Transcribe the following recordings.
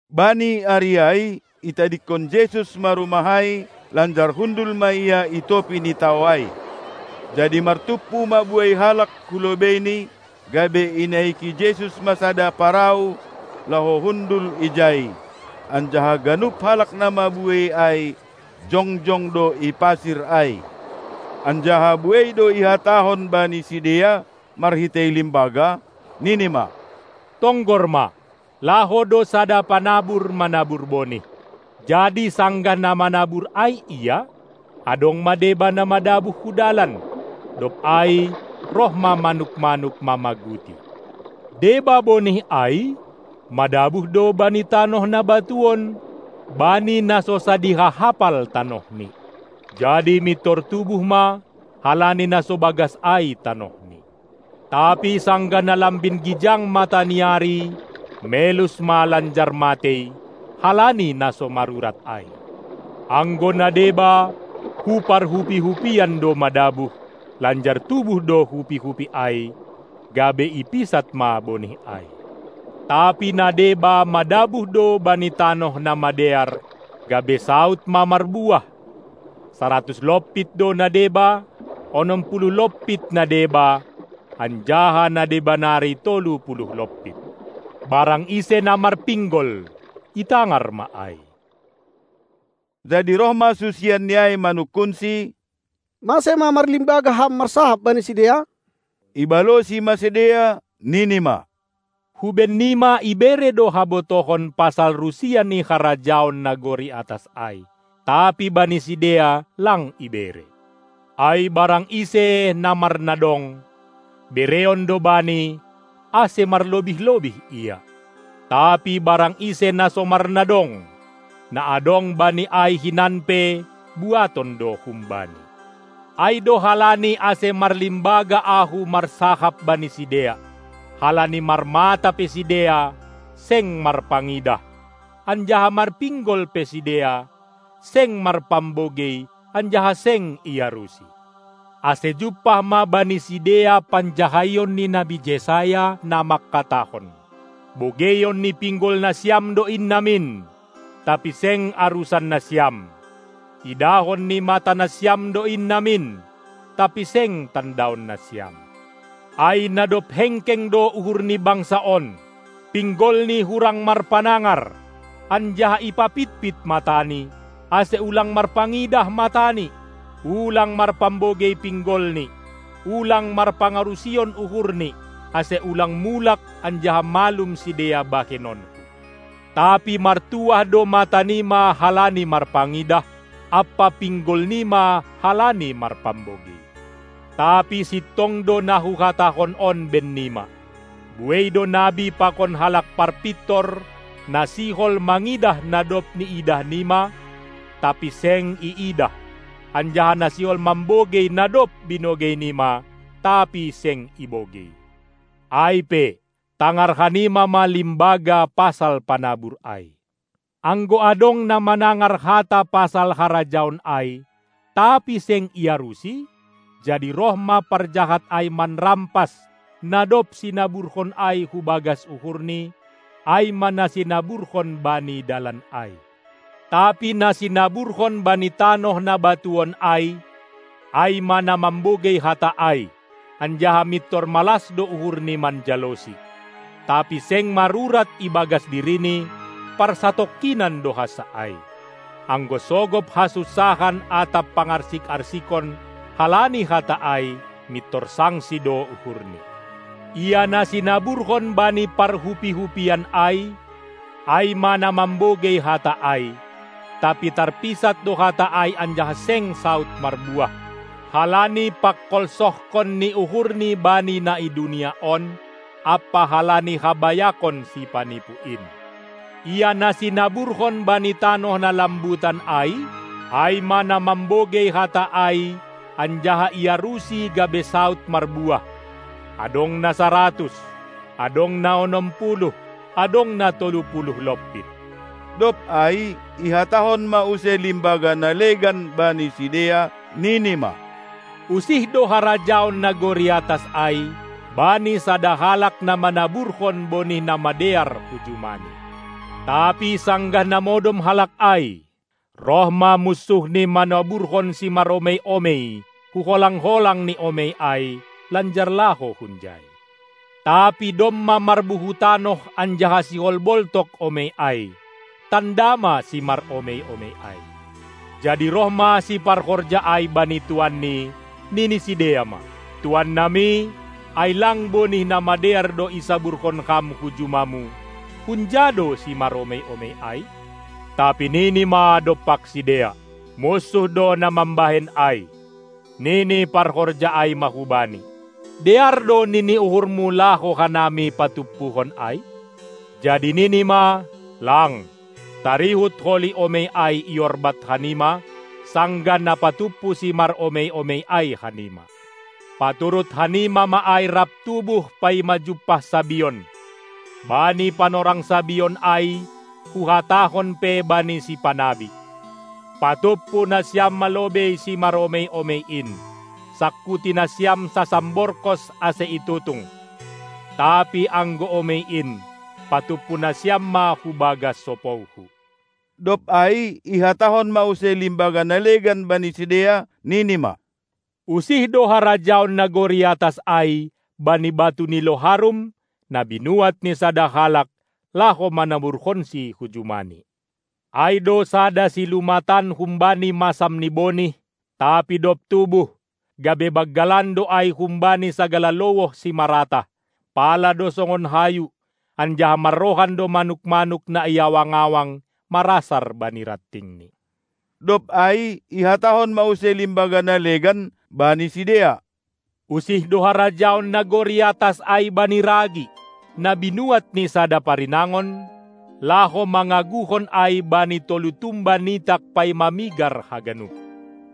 Bani ari ai itadingkon Jesus ma rumah ai, lanjar hundul ma Ia i topi ni tao ai. Jadi martumpu ma buei halak hu lobeiNi, gabe inaiki Jesus ma sada parau laho hundul ijai, anjaha ganup halak na mabuei ai jongjong do i pasir ai. Anjaha buei do ihatahon bani sidea marhitei limbaga, nini ma: Tonggor ma, laho do sada panabur manabur bonih. Jadi sanggah na manabur ai ia, adong ma deba na madabuh hu dalan, dob ai roh ma manuk-manuk mamaguti. Deba bonih ai madabuh do bani tanoh na batuon, bani na so sadiha hapal tanohni, jadi mintor tubuh ma, halani na so bagas ai tanohni. Tapi sanggah na lambin gijang mataniari melus ma lanjar matei, halani na so marurat ai. Anggo na deba, hu parhupi-hupian do madabuh, lanjar tubuh do hupi-hupi ai, gabe ipisat ma bonih ai. Tapi na deba madabuh do bani tanoh na madear, gabe saud ma marbuah, saratus lompit do na deba, onom puluh lompit na deba, anjaha na deba nari tolu puluh lompit. Barang ise na marpinggol, itangar ma ai! Jadi roh ma susianNi ai manungkunSi: Mase ma marlimbaga Ham marsahap bani sidea? Ibalosi ma sidea, nini ma: Hu bennima ibere do habotohon pasal rusia ni harajaon nagori atas ai, tapi bani sidea lang ibere. Ai barang ise na marnadong, bereon do bani, ase marlobih-lobih ia. Tapi barang ise na so marnadong, na adong bani ai hinan pe buaton do humbani. Ai do halani ase marlimbaga Ahu marsahap bani sidea, halani marmata pe sidea seng marpangidah, anjaha marpinggol pe sidea seng marpambogei anjaha seng iarusi. Ase jumpah ma bani sidea panjahaion ni nabi Jesaya, na mangkatahon: Bogeion ni pinggol nasiam do in namin, tapi seng arusan nasiam, idahon ni mata nasiam do in namin, tapi seng tandaon nasiam. Ai na dob hengkeng do uhur ni bangsa on, pinggolni hurang marpanangar anjaha ipapitpit matani, ase ulang marpangidah matani, ulang marpambogei pinggolni, ulang marpangarusion uhurni, ase ulang mulak anjaha malum sidea bahenonKu. Tapi martuah do matanima halani marpangidah, ampa pinggolnima halani marpambogei. Tapi sintong do na Huhatahon on bennima: Buei do nabi pakon halak parpintor na sihol mangidah na dob niidahnima, tapi seng iidah, anjaha na sihol mambogei na dob binogeinima, tapi seng ibogei. Ai pe, tangar hanima ma limbaga pasal panabur ai! Anggo adong na manangar hata pasal harajaon ai, tapi seng iarusi, jadi roh ma parjahat ai manrampas na dob sinaburhon ai hu bagas uhurni, ai ma na sinaburhon bani dalan ai. Tapi na sinaburhon bani tanoh na batuon ai, ai ma na mambogei hata ai, anjaha mintor malas do uhurni manjalosi, tapi seng marurat ibagas dirini, parsatongkinan do hansa ai. Anggo sogop hasunsahan atap pangarsik-arsikon halani hata ai, mintor sangsi do uhurni. Ia na sinaburhon bani parhupi-hupian ai, ai ma na mambogei hata ai, tapi tarpisat do hata ai anjaha seng saud marbuah, halani pangkolsohkon ni uhurni bani na i dunia on ampa halani habayakon sipanipu in. Ia na sinaburhon bani tanoh na lambutan ai, ai ma na mambogei hata ai anjaha iarusi gabe saud marbuah, adong na saratus, adong na onom puluh, adong na tolu puluh lompit. Dob ai ihatahon ma use limbaga na legan bani sidea, nini ma: Usih do harajaon nagori atas ai bani sada halak na manaburhon bonih na madear hu jumani. Tapi sanggah na modom halak ai, roh ma munsuhni manaburhon simaromei-omei hu holang-holang ni omei ai, lanjar laho hunjai. Tapi domma marbuhu tanoh anjaha sihol boltok omei ai, tanda ma simaromei-omei ai. Jadi roh ma siparhorja ai bani tuanni, nini sidea ma: Tuannami, ai lang bonih na madear do isaburhon ham hu jumamu? Hunja do simaromei-omei ai? Tapi nini ma dompak sidea: Munsuh do na mambahen ai. Nini parhorja ai ma hubani: Dear do nini uhurmu laho hanami patumpuhon ai? Jadi nini ma: Lang, tarihut holi omei ai iorbat hanima, sanggah na patumpu simaromei-omei ai hanima. Paturut hanima ma ai rap tubuh paima jumpah sabion. Bani panorang sabion ai Huhatahon pe bani sipanabi: Patumpu nasiam ma lobei simaromei-omei in, sangkuti nasiam sasamborkos ase itutung; tapi anggo omei in, patumpu nasiam ma Hu bagas sopouHu. Dob ai ihatahon ma use limbaga na legan bani sidea, nini ma: Usih do harajaon nagori atas ai bani batu ni loharum, na binuat ni sada halak laho manaburhonsi hu jumani. Ai do sada silumatan humbani masam ni bonih, tapi dob tubuh, gabe banggalan do ai humbani sagala lowoh simaratah, pala do songon hayu, anjaha marrohan do manuk-manuk na i awang-awang marasar bani rantingni. Dob ai ihatahon ma use limbaga na legan bani sidea: Usih do harajaon nagori atas ai bani ragi, na binuat ni sada parinangon, laho mangaguhon ai bani tolu tumba nitak paima migar haganup.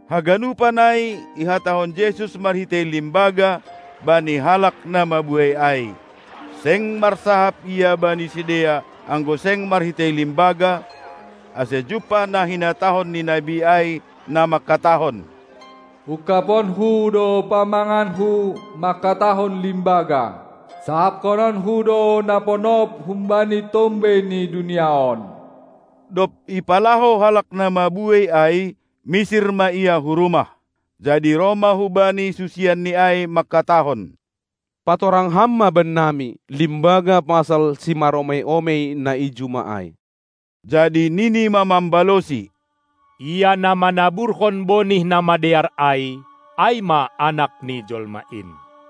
Haganupan ai ihatahon Jesus marhitei limbaga bani halak na mabuei ai; seng marsahap Ia bani sidea anggo seng marhitei limbaga, ase jumpah na hinatahon ni nabi ai, na mangkatahon: UngkabonKu do pamanganKu mangkatahon limbaga, sahaphononKu do na ponop humbani tombei ni dunia on. Dob ipalaho halak na mabuei ai, misir ma Ia hu rumah. Jadi roh ma hu Bani susianNi ai mangkatahon: Patorang Ham ma bennami limbaga pasal simaromei-omei na i juma ai! Jadi nini ma mambalosi: Ia na manaburhon bonih na madear ai, ai ma Anak ni Jolma in.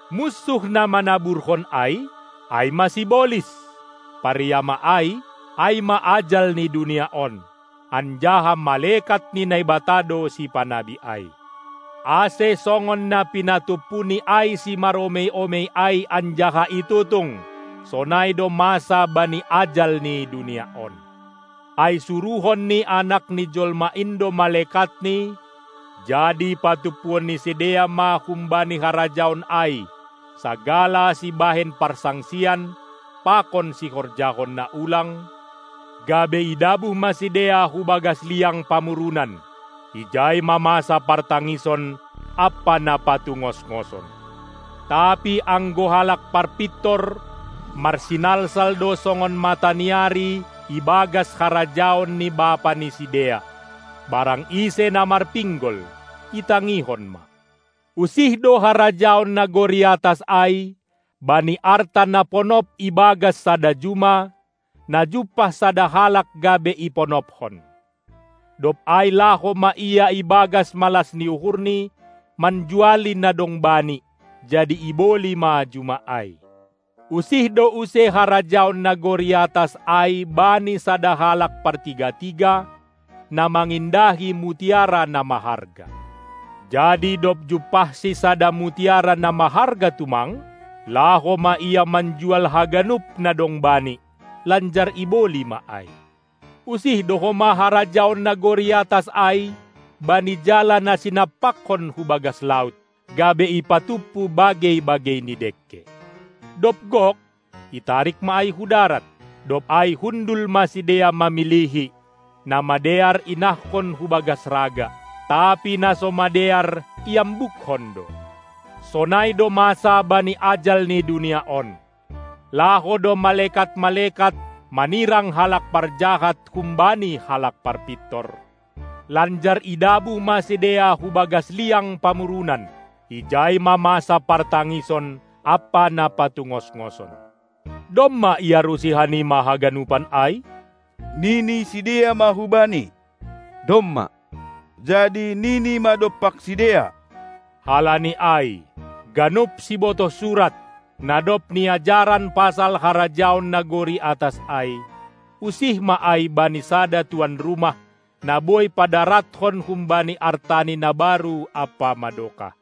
Munsuh na manaburhon ai, ai ma sibolis; pariama ai, ai ma ajal ni dunia on, anjaha malekat ni Naibata do sipanabi ai. Ase songon na pinatumpuni ai simaromei-omei ai anjaha itutung, sonai do masa bani ajal ni dunia on. Ai suruhon ni Anak ni Jolma in do malekatNi, jadi patumpuon ni sidea ma humbani harajaon ai sagala sibahen parsangsian pakon sihorjahon na ulang, gabe idabuh ma sidea hu bagas liang pamurunan; ijai ma masa partangison ampa na patungosngoson. Tapi anggo halak parpintor marsinalsal do songon mataniari ibagas harajaon ni Bapa ni sidea. Barang ise na marpinggol, itangihon ma! Usih do harajaon nagori atas ai bani arta na ponop ibagas sada juma, na jumpah sada halak gabe iponopkon. Dob ai laho ma ia ibagas malas ni uhurni manjuali na dong bani, jadi iboli ma juma ai. Usih do use harajaon nagori atas ai bani sada halak partiga-tiga, na mangindahi mutiara na maharga. Jadi dob jumpahsi sada mutiara na maharga tumang, laho ma ia manjual haganup na dong bani, lanjar iboli ma ai. Usih do homa harajaon nagori atas ai bani jala na sinampakkon hu bagas laut, gabe ipatumpu bagei-bagei ni dengke. Dob gok, itarik ma ai hu darat. Dob ai hundul ma sidea mamilihi, na madear inahkon hu bagas raga, tapi na so madear iambukkon do. Sonai do masa bani ajal ni dunia on. Laho do malekat-malekat manirang halak parjahat humbani halak parpintor, lanjar idabuh ma sidea hu bagas liang pamurunan; ijai ma masa partangison ampa na patungosngoson. Domma iarusi hanima haganupan ai? Nini sidea ma hu-Bani: Domma. Jadi nini ma dompak sidea: Halani ai, ganup sibotoh surat, na dob niajaran pasal harajaon nagori atas ai, usih ma ai bani sada tuan rumah, na boi padarathon humbani artani na baru ampa madokah.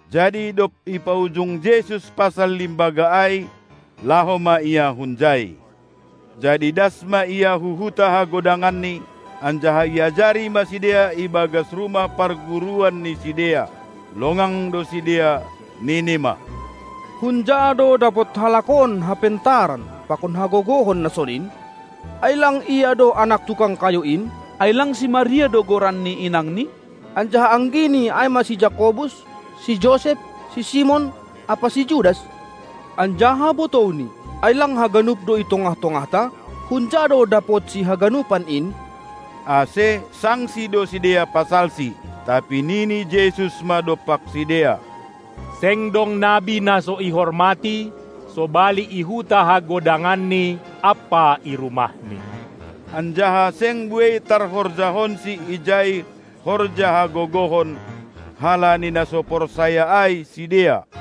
Jadi dob ipaujung Jesus pasal limbaga ai, laho ma Ia hunjai. Jadi das ma Ia hu huta hagodanganNi, anjaha iajari ma sidea ibagas rumah parguruan ni sidea. Longang do sidea, nini ma: Hunja do dapot halak on hapentaran pakon hagogohon na sonin? Ai lang Ia do anak tukang kayu in? Ai lang si Maria do goran ni inangNi, anjaha anggiNi ai ma si Jakobus, si Josep, si Simon ampa si Judas? Anjaha botouNi, ai lang haganup do i tongah-tongahta? Hunja do dapotSi haganupan in? Ase sangsi do sidea pasalSi. Tapi nini Jesus ma dompak sidea: Seng dong nabi na so ihormati, sobali i huta hagodanganni ampa i rumahni. Anjaha seng buei tarhorjahonSi ijai horja hagogohon, halani na so porsaya ai sidea.